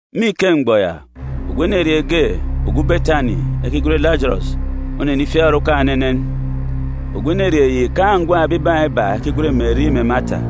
Me ike mgbọ ya, ogwu enerieen̄ ge, ogwu Betani, ekigwen Lajọrọs, onenifiak orukan̄ enenen. Ogwu enerieen̄ yi îkaan̄ ngwan̄ ebibaan̄ iba ekigwen Meri mè Mata.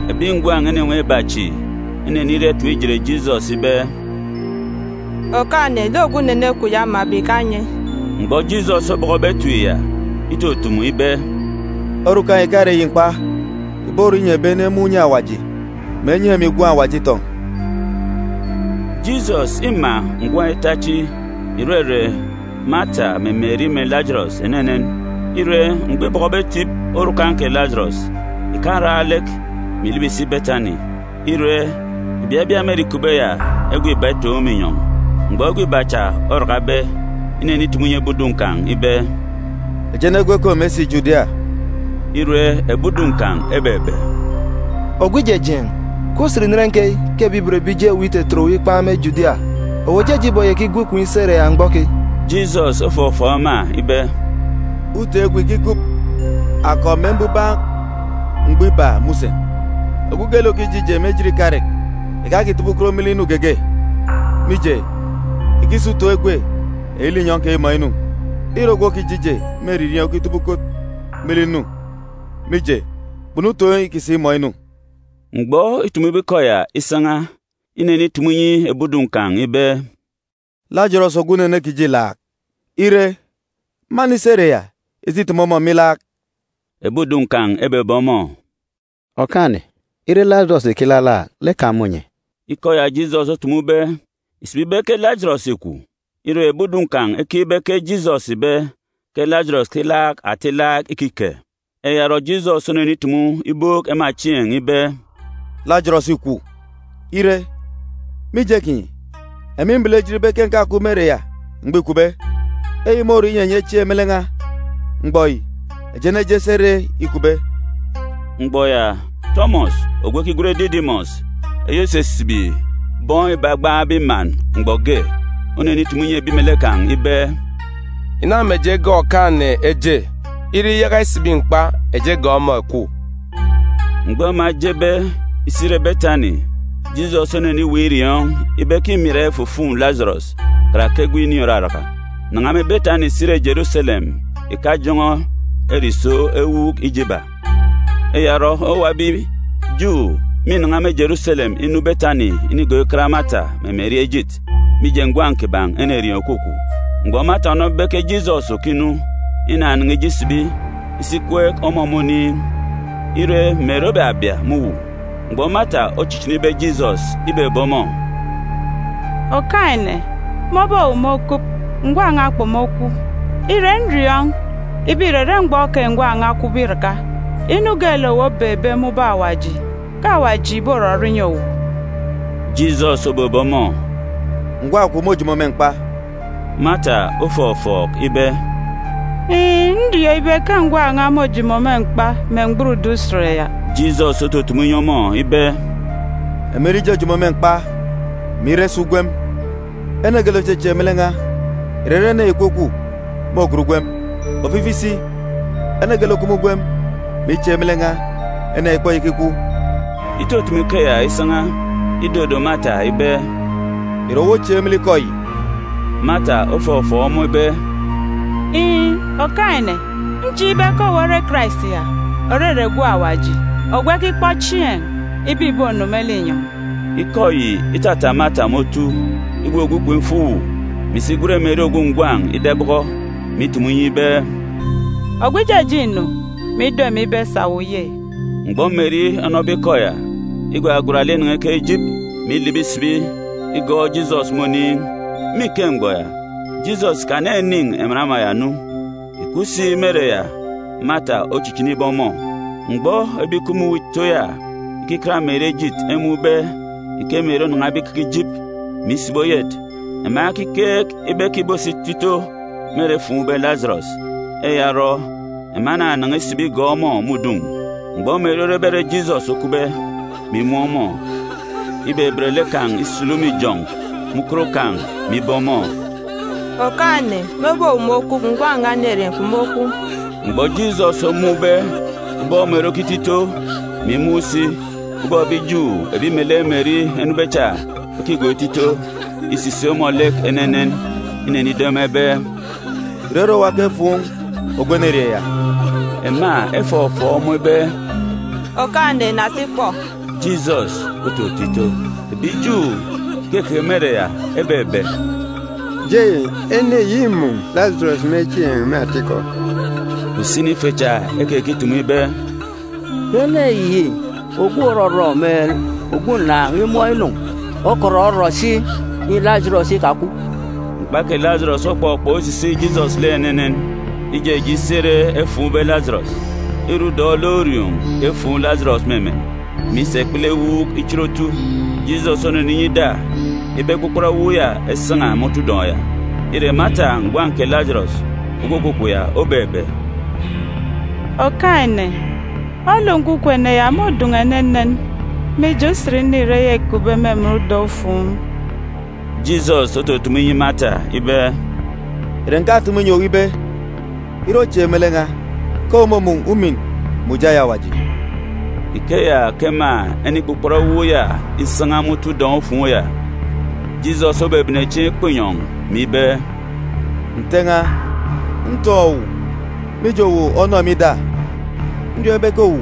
Ebi ngwan̄ enenwaan̄ iba chi, eneniria etip ijet Jisọs ibe, “Okaan̄-ene, lek ogwu unene kwun̄ ya omabe ìkanye.” Mgbọ Jisọs obọkọbe etip ya, itutumu ibe, “Orukan̄ yi ìkare eyi mkpa, ìborọ inyi ebi ene emun̄ unye Awaji, mè enyi emi Gwun̄ Awaji itọn̄.” Jisọs îma ngwan̄ ita chi, ìrere Mata mè Meri mè Lajọrọs, enenen. Ire, mgbọ îbọkọbe etip orukan̄ kè Lajọrọs, ìkaran lek, mè ìlibi ìsi Betani. Kpan̄asi ikeya, ìbabia me ere îkupbe ya egwe iba itoon̄ me inyọn̄. Mgbọ egwe iba cha orakabe, inenitumu inyi ebi udun̄ kan̄ ibe, “Eji enegwu ekom esi Judia.” Ire, ebi udun̄ kan̄ ebebe, “Ogwu Ijejeen̄, ke usen inen keyi ke ebi ibot ebi Ju eweek itetet owu ikpan̄ me Judia. Owu òjeje iboyaka igwu ikom isi ere ya mgbọ keyi?” Jisọs ofọfọọk ema ibe, “Utoon̄ egwe ìkikup akọp mè mbubak mgbọ iba me usen. Ogwu geelek òkije ije me ejit ikarek ìkakitọbọ ukot me lek inu geege, mije, ìkisa utoon̄ egwe eyi linyọn̄ keyi imọọn̄ inu. Îre ogwu òkije ije me eririeen̄ okitọbọ ukot me lek inu, mije, kpunu utoon̄ îkisa imọọn̄ inu.” Mgbọ îtumube ikọ ya isan̄a, inenitumu inyi ebi udun̄ kan̄ ibe, “Lajọrọs ogwu unene kiji îlaak. Ire, mânisi ere ya isi itimi ọmọ me ilaak.” Ebi udun̄ kan̄ ebebe ọmọ, “Okaan̄-ene, ire Lajọrọs ìkilalaak, lek kan̄ mônye.” Ikọ ya Jisọs otumube ìsibi ibe ke Lajọrọs îkwu. Ire, ebi udun̄ kan̄ ekeek ibe ke Jisọs ìbe ke Lajọrọs ìkilaak ata ilaak ikike. Eya orọ, Jisọs onenitumu ibook ema chieen̄ ibe, “Lajọrọs îkwu. Ire, mije kinyi, emi mbele ejit ibe ke ǹkakup me ere ya mgbọ îkwube. Eyi môrọ inyi enyi echieek me lek n̄a. Mgbọ yi, eji eneje esi ere îkupbe.” Mgbọ ya, Tọmọs ogwu ekigwen Didimọs (eyi òsisibi bọn m̀gban iba) onenitumu inyi ebi melek kan̄ ibe, “Ìna mè eji egọọk Okaan̄-ene eje. Ire iyaka isibi mkpa, eji egọọk ọmọ èkwu.” Mgbọ ema ejebe isi ire Betani, Jisọs oneniweek iriọọn̄ ibe ke mîra ifufuun̄ Lajọrọs karake egwe ini òraraka. Nan̄a me Betani si re Jeruselem ìkajọn̄ọ ere ìso ewuuk ije iba. Eya orọ, owuwa ebi Ju mînan̄a me Jeruselem inu Betani inigọọk ikat Mata mè Meri ejit, mije ngwan̄ kiban̄ enerieen̄ òkwukwu. Mgbọ Mata onọbe ibe ke Jisọs òkinu, inanan̄a ije isibi isi ikweek ọmọ me oniin̄. Ire, Meri obabia me uwu. Mgbọ Mata ochichinibe Jisọs, ibebe ọmọ, “Okaan̄-ene, mebe owu mokup, ngwan̄ n̄a kpomokwu. Ire, nriọọn̄ ibe, ìrere mgbọ keyi ngwan̄ n̄a okwube iraka, inu geelek owu obeekbe me ubọk Awaji, ke Awaji ìborọrọ inyi owu.” Jisọs obebe ọmọ, “Ngwan̄ kwun̄ môjomo me mkpa.” Mata ofọfọọk ibe, “Iin̄, nriọọn̄ ibe ke ngwan̄ n̄a môjomo me mkpa me mgburudun̄ Usen ya.” Jisọs otutumu inyi ọmọ ibe, “Emi nre ijojomo me mkpa, mè ire si ugwem. Ene geelek òchechieek me lek n̄a, ìrere ene ya ìkwukwu, môgat ugwem. Ofifi si, ene geelek òkup me ugwem mè ichieek me lek n̄a, ene ya ìkpoyaka ikwu.” Itutumu ikeya isan̄a, idodo Mata ibe, “Ìre owu ochieek me lek ikọ yi?” Mata ofọfọọk ọmọ ibe, “Iin̄, Okaan̄-ene, nchieek ibe ke owu ore Karais ya, òrere Gwun̄ Awaji, ogwu ekikpọ chieen̄ ibe ìbonu me linyọn̄.” Ikọ yi itata Mata me otu, igwugwu ikom ifo uwu, mè isi igwen Meri ogwu ngwan̄ ida ibọkọ, mè itumu inyi ibe, “Ogwu Ijejeen̄ înu, mè ido emi ibe sà owu ye?” Mgbọ Meri onọbe ikọ ya, igwagwat lek inan̄a ikeke jîp, mè ilibi isibi igọọk Jisọs me oniin̄. Me ike mgbọ ya, Jisọs ìkaninin̄ emen ama ya nu, ìkup si me ere ya Mata ochichinibe ọmọ. Mgbọ ebi ìkup me uwu ito ya ikikat Meri ejit emun̄be ike Meri onan̄abe ikeke jîp, mè isibi oyet, ema ekikeek ibe ke ìbosi ito ito me ere efuun̄be Lajọrọs. Eya orọ, ema enanan̄a isibi igọọk ọmọ me udun̄. Mgbọ Meri orebe ere Jisọs okupbe, mè imun̄ ọmọ, ibeben lek kan̄ isulu me ijọn̄ me ukot kan̄, mè ibe ọmọ, “Okaan̄-ene, mebe owu mokup, ngwan̄ n̄a enerieen̄ kpomokwu.” Mgbọ Jisọs omun̄be ubọk Meri okito ito, mè imun̄ si ubọk ebi Ju ebi melek Meri enube cha ekigọọk ito ito, îsisik ọmọ lek enenen. Inenido ema ibe, “Ìre ere owa ke enyi efuun̄ ogwu enerieen̄ ya?” Ema efọfọọk ọmọ ibe, “Okaan̄-ene, na si kpọ.” Jisọs ototo ito. Ebi Ju ìkekeke me ere ya ebebe, “Jei, ene yi îmun̄ Lajọrọs me chieen̄ me atikọ.” Usini ife cha ekekitumu ibe, “Kè ene yi ogwu òrọrọ mè ogwu ǹnàan̄ imọọn̄ inu okọt orọ si inyi Lajọrọs ikakwu.” Mkpa kè Lajọrọs okpọkpọk isisik Jisọs lek enenen, ijeje isi ere efuun̄be Lajọrọs. Îre emen ǹkororok ge ke efuun̄ Lajọrọs, mè isa ikpele ewuuk ichit otu. Jisọs oneninyi ida ibe ekpukpọt ewuuk ya esan̄a me otu udọn̄ ya. Ire, Mata ngwan̄ kè Lajọrọs ogwu òkwukwu ya obebe, “Okaan̄-ene, olu nkwukwu ene ya môdun̄u enenen, mije, usen ini ire eya îkupbe me emen udọn̄-ufuun̄.” Jisọs otutumu inyi Mata ibe, “Ìre ǹkatumu ìnyi owu ibe ire ochieek me lek n̄a, ke owu mômun̄ ujamgbugbo eyi Awaji?” Ikeya ke ema enikpukpọt ewuuk ya isan̄a me otu udọn̄-ufuun̄ ya. Jisọs obebene chieen̄ ikpọ inyọn̄, mè ibe, “Nte n̄a, ntọn̄ owu, mije, owu onọ emi ida. Nriọọn̄ ibe ke owu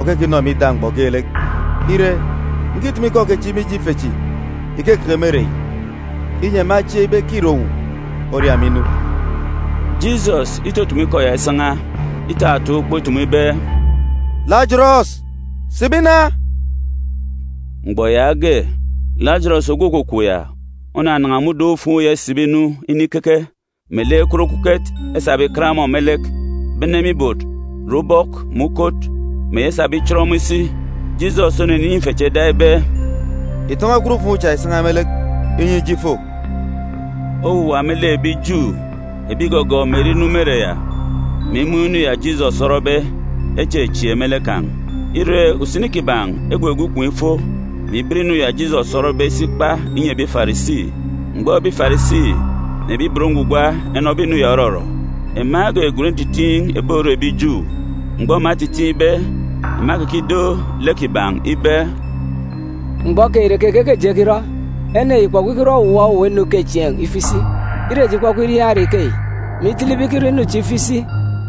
òkekinọ emi ida mgbọ geelek. Ire, ǹkitumu ikọ kechi mije ife chi ìkekeke me ere yi, inyi ema echieek ibe ke îre owu oria emi inu.” Jisọs itutumu ikọ ya isan̄a, itataan̄ ukpo itumu ibe, “Lajọrọs, sibi na!” Mgbọ yaage, Lajọrọs ogwu òkwukwu ya onanan̄a me udọn̄-ufuun̄ ya isibi inu inikeke, melek ekwut okuket esabe ikat ọmọ me lek, bene me ibot re ubọk mè ukot, mè eyi esabe ichit ọmọ isi. Jisọs onyinyi ife cha ida ibe, “Ìtọn̄ọ ekwut-ufuun̄ cha ìsan̄a me lek, inyi ije ifo.” Owuwa me lek ebi Ju ebi ìgọgọọk Meri inu me ere ya, mè imun̄ inu ya Jisọs orọbe, echechieek me lek kan̄. Ire, usini kiban̄ egwugwu ikom ifo, mè iben inu ya Jisọs orọbe isi ikpa inyi ebi Farisi. Mgbọ ebi Farisi mè ebi ibot ngwugwa enọbe inu ya òrọrọ, ema egwegwen ntitiin̄ ebi Oru ebi Ju. Mgbọ ema etitiin̄be, ema ekekido lek kiban̄ ibe, “Mgbọ keyi, ìre keke ke eji ekirọ? Ene yi ìkpọkpọ ikirọ owuwa owuwa inu ukechieen̄ ifo isi. Ire eji ikpọkpọ iriaan̄ ere ikeyi, mè itele ibe ikirọ inu chi ifo isi,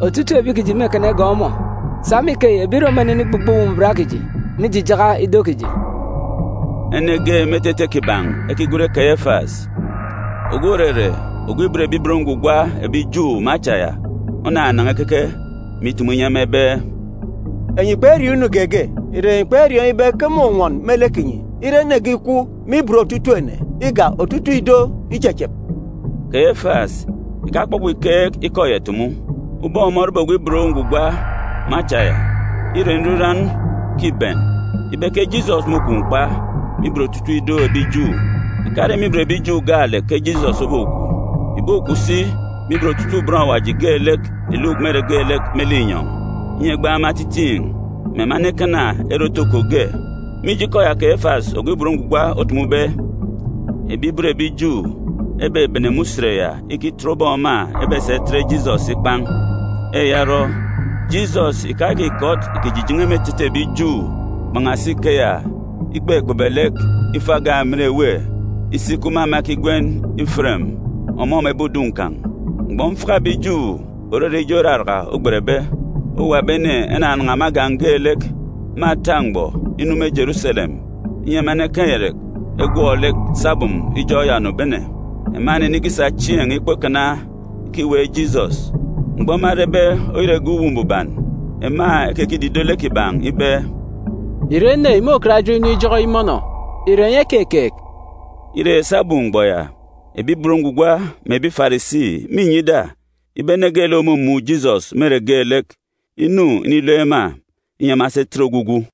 otutuuk ebi kiji mêkana igọọk ọmọ. Sa me ikeyi, ebi Rom mênenigbugbọ Uwu Mbuban kiji, mè ijijaka ido kiji.” Ene ge me etete kiban̄ ekigwen Keyefas, ogwu òrere ogwu òban Awaji me acha ya onanan̄a ikeke, mè itumu inyi ema ibe, “Enyi kperiọọn̄ inu geege. Ìre enyi kperiọọn̄ ibe ke mônwọn me lek kinyi ire ene ge ikwu me ibot otutuuk ene, igak otutuuk ido ichechep?” Keyefas ìkakpọkpọ ìkeek ikọ ya ìtumu. Ubọk ọmọ orebe ogwu òban Awaji me acha ya, îre nriran ke îben ibe ke Jisọs môkwu mkpa me ibot otutuuk ido ebi Ju. Ìkare me ibot ebi Ju gaalek ke Jisọs obokwu. Ìbokwu si me ibot otutuuk bọn Awaji geelek ìluk me ere geelek me linyọn̄, inyi egbaan̄ ema etitiin̄, mè ema enekana ere otoko ge. Mije ikọ ya Keyefas ogwu òban Awaji otumube, ebi ibot ebi Ju ebebene me usen ya ikitọt ubọk ema ebesa itet Jisọs ikpan̄. Eya orọ, Jisọs ìkayaka ìkọt ìkijijen̄e me etete ebi Ju. Kpan̄asi ikeya, ikpekpebe lek ifo agan̄ emen èwê isi ikup me ama ekigwen Iferem, ọmọ me ebi udun̄ kan̄. Mgbọ mfaka ebi Ju, òrere ijọk Iraraka ogbetbe, owuwa ebi ene enanan̄a me agan̄ geelek, me ata mgbọ, inu me Jeruselem, inyi ema enekaan̄ irek egwọk lek sabum ijọk ya ònobene. Ema enenikisa chieen̄ ikpọ ikana ikiweek Jisọs. Mgbọ ema erebe oyet egep Uwu Mbuban, ema ekekidido lek kiban̄ ibe, “Ìre ene yi môkat ejit inu ijọk yi mọnọ? Ìre enyi ekekeek?” Ire, sabum mgbọ ya, ebi ibot ngwugwa mè ebi Farisi mînyi ida ibe ene geelek òmumun̄ Jisọs me ere geelek, inu inilook ema, inyi ema esi etet ogwugwu.